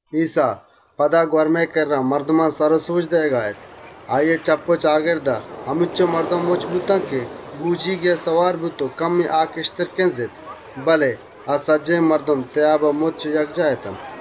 ‏ ایسّا پدا مَزَن‌گوَرمئے کِرّا، مردمان درس و سَبک دئیگا اَت. آییئے چپّ و چاگردا همینچُک مردم مُچّ بوت که بۆجیگێا سوار بوت و کَمُّکے آ کَشتر کِنزت، بله سجّهێن مردم گوَرمئے تئیابا مُچّ و یکجاه اتنت. ‏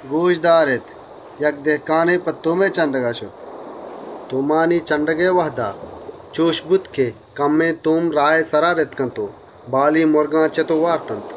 «گۆش دارێت. یک دِهکانے په تُهمئے چَنڈگا شت، ‏ تُهمانی چَنڈگئے وهدا کَمُّکے تُهم راهئے سرا رِتک و بالی مُرگان چِت و وارتنت. ‏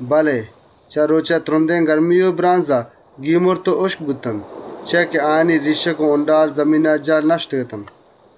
بله چه رۆچئے ترُندێن گرمیا گیمُّرت و هُشک بوتنت، چیا که آیانی ریشّگ و وَنڈال، زمینا جُهل نشُتگ‌اتنت. ‏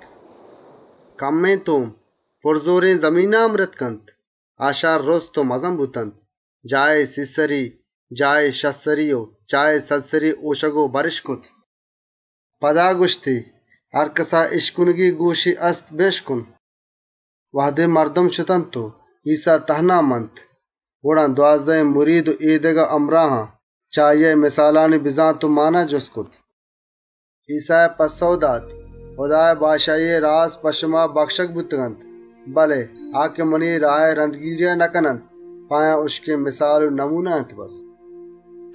دگه کمّے تُهم، شَرّێن زمینا رِتک، آ شَرّ رُست و مزن بوتنت، جاهے سی سَری، جاهے شَست سَری و جاهے سَد سَری هۆشگ و بَرِش کرت.» ‏ پدا گوَشتی: «هرکَسا په اِشکنگا گۆش هست، بِشکنت.» ‏ وهدے مردم شتنت و ایسّا تهنا مَنت، گڑا دوازدهێن مرید و اے دگه همراهان، چه آییا اے مِسالانی مانا جُست کرت. ‏ ایسّایا پَسّئو دات: «هُدائے بادشاهیئے راز په شما بَکشگ بوتگ، بله آ که منی راهئے رَندگیریا نکننت، اے چیز په آیان هُشکێن مِسال و دَروَر اَنت و بسّ، ‏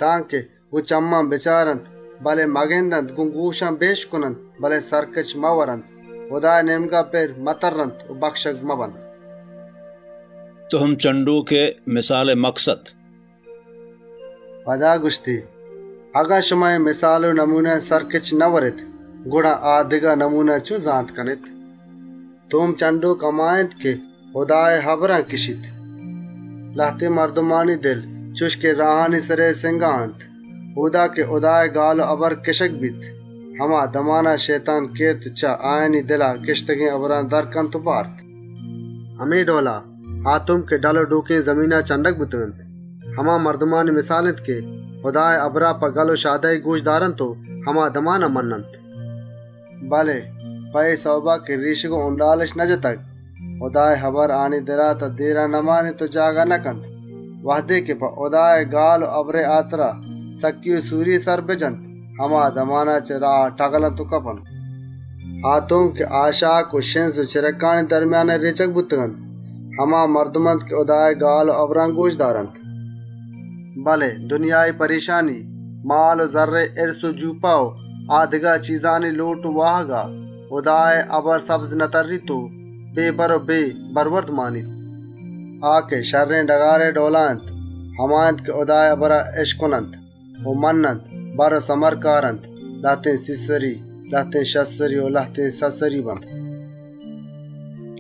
تانکه: گۆن چمّان بچارنت، بله مگندنت گۆن گۆشان بِشکننت، بله سَرکِچ مئوَرنت، هُدائے نێمگا پِر مترّنت و بَکشگ مبنت.» تُهم چَنڈگئے مِسالئے مکسد ‏ پدا گوَشتی: «اگن شما اے مِسالا سَرکِچَ نئوَرێت، گڑا آ دگه مِسالان چۆن زانتَ کنێت؟ ‏ تُهم چَنڈۆک هما اِنت که هُدائے هبرا کِشیت. ‏ لهتێن مردم راهئے سرا رتکگێن تُهمئے ڈئولا اِنت. هُدائے گال و هبر که اۆدا کِشگَ بیت، هما دمانا شئیتانَ کئیت و چه آیانی دلا کِشتگێن هبرا درَ کنت و بارت. ‏ همے ڈئولا، آ تُهم که ڈَل و ڈۆکانی سرا رتکنت، هما مردمانی مِسال اِنت که هُدائے هبرا گۆشَ دارنت و هما دمانا په گَل و شادهیَ مَنّنت، ‏ بله په اے سئوبا که ریشّگ و وَنڈالِش نجتگ، هُدائے کُلئو آیانی دلا، تان دێرا نمانیت و جاگهَ نکنت. وهدے په هُدائے گال و هبرانیگی سکّی و آزارے سر بجنت، هما دمانا چه راها ٹَگلنت و کپنت. ‏ آ تُهم که شِزّ و ڈَنگرانی نیاما رێچگ بوتنت، هما مردم اَنت که هُدائے گال و هبرا گۆشَ دارنت ‏ بله دنیایی پرێشانی و مال و زَرّئے هِرس و جۆپَه و آ دگه چیزانی لۆٹ و واهگ آیان ردَ دئینت و نئیلنت هُدائے هبر سبز بترّیت و بَر و بَروَرد بدنت. ‏ آ که شَرّێن زمینئے ڈئولا اَنت، هما اَنت که هُدائے هبرا اِشکننت و مَنّنت، بَر و بَروَردَ دئینت، لهتێن سی سَری، لهتێن شَست سَری و لهتێن سد سَریَ بیت.»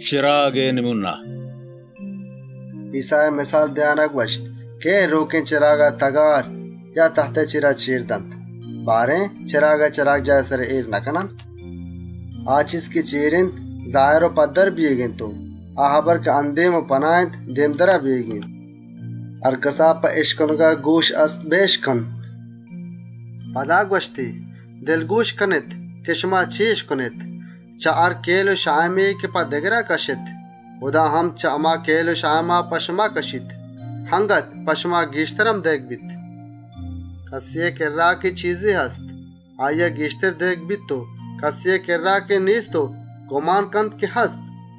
چِراگئے مِسال ‏ ایسّایا مِسال دئیانا گوَشت: «کئے رۆکێن چِراگا تَگار، یا تَهتئے چێرا چێرَ دنت؟ چِراگا چِراگجاهئے سرا اێرَ نکننت؟ ‏ آ چیز که چێر اِنت، زاهر و پَدّر بئیگی اِنت و آ هبر که پناه و اَندێم اِنت، آشکار و دێمدرا بئیگی اِنت. ‏ هرکَسا په اِشکنگا گۆش هست، بِشکنت.» ‏ پدا گوَشتی: «دلگۆش کنێت که شما چے اِشکنێت. گۆن هر کئیل و پئیمانهێا که بدئیێت، گۆن هما کئیلا شمارا دئیگَ بیت. اَنگت گێشتر هم شمارا رسیت. ‏ کَسێا که چیزے هست، آییا گێشتر دئیگَ بیت و کَسێا که نێست،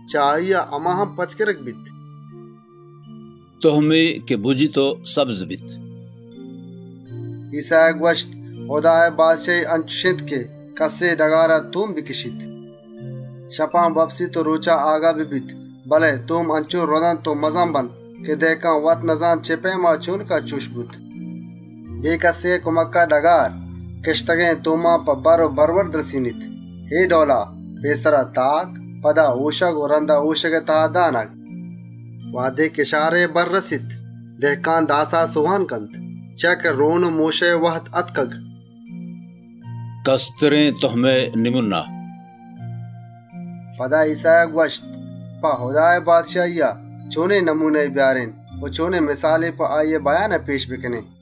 چه آییا هما که هست‌اِنتی هم پَچ گِرگَ بیت.» تُهمے که بُجیت و سبزَ بیت ‏ ایسّایا گوَشت: «هُدائے بادشاهی، انچُش اِنت که کَسے ڈگارا تُهم بکِشیت. ‏ شپا بوَپسیت و رۆچا آگاه ببیت. بله تُهم انچُشَ رُدنت و مزنَ بنت که دِهکان وتَ نزانت چِه پئیما و چۆنکا چُش بوت. ‏ بے کَسێئے کُمکا ڈگار، کِشتگێن تُهما په بَر و بَروَردَ رسێنیت. اے ڈئولا: پێسرا تاک، پدا هۆشگ و رَندا هۆشگئے تها دانگ. ‏ وهدے کِشارئے بَرَ رَسیت، دِهکان داسا سۆهانَ کنت، چیا که رۆن و مۆشئے وهد آتکگ.» کَسترێن تُهمئے مِسال ‏ پدا ایسّایا گوَشت: «په هُدائے بادشاهیا، چۆنێن دَروَرے بیارێن و چۆنێن مِسالے په آییئے بئیانا پێش بکنێن؟ ‏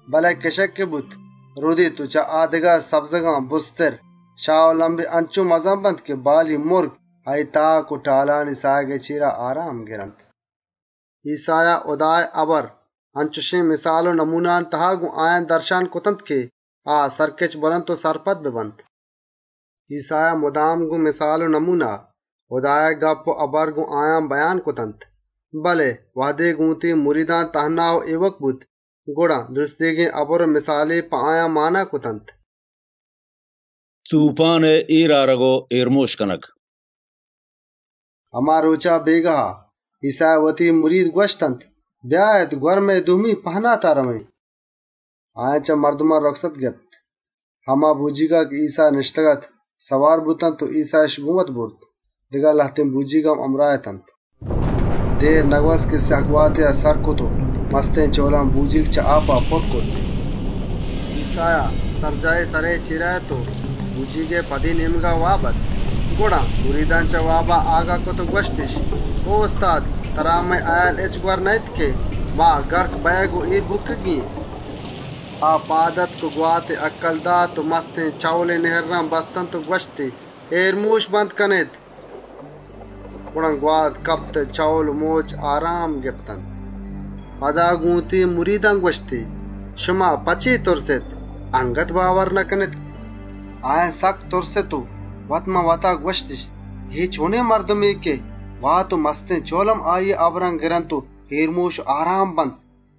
بله کِشگ که بوت، رُدیت و چه آ دگه سبزگان بُرزترَ بیت، شاه و لَمبی انچُش مزنَ بنت که بالی مُرگ، آییئے تاک و ٹالانی ساهگئے چێرا کُدۆه و کُدام بندنت.» ‏ ایسّایا هُدائے هبر اَنچێن مِسال و دَروَرانی تها گۆن آیان درشانَ کرتنت که آ سَرکِچ بوَرنت و سرپد ببنت. ‏ بے دَروَر و مِسالان هچ هبریَ نکرت، بله وهدے گۆن وتی مریدان تهنا بوت، گڑا سجّهێنی په آیان مانا کرتنت. توپّانئے اێرمۆش کنگ ‏ هما رۆچا، بێگاها، ایسّایا گۆن وتی مریدان گوَشت: «بیاێت گوَرمئے دومی نێمگا رئوێن.» ‏ آیان چه مردمان رُکست گپت، هما بۆجیگا که ایسّا نِشتگ‌اَت سوار بوتنت و ایسّااِش گۆن وت برت. دگه لهتێن بۆجیگ هم همراه اَت. ‏ دێر نگوَست که مزنێن سْیَه‌گواتێا سر کرت و مستێن چئول و مئوجان بۆجیگ چه آپا پُرّ کرت. ‏ ایسّایا، سَرجاهے سرئے چێرا اَت و بۆجیگئے پُشتی نێمگا، واب اَت. گڑا مریدان، چه وابا آگاه کرت و گوَشتِش: «او استاد! ترا مئے هئیال هچّ گوَر نه‌اِنت که ما اێر بُکّگی و مِرَگی اێن؟» ‏ آ چه وابا آگاه بوت، گواتی هَکَّل دات و مستێن چئولی نِهرّان بستنت و گوَشتی: «اێرمۆش! بند کنێت!» گڑا گوات کپت و چئول و مئوج آرام گپتنت. ‏ پدا گۆن وتی مریدان گوَشتی: «شمارا په چے تُرسیت؟ اَنگت باورَ نکنێت؟» ‏ آیان سکّ تُرست و وت‌مان‌وتا گوَشتِش: «اے چۆنێن مردمے که گوات و چئول هم اِشیئے هُکما مَنّنت؟»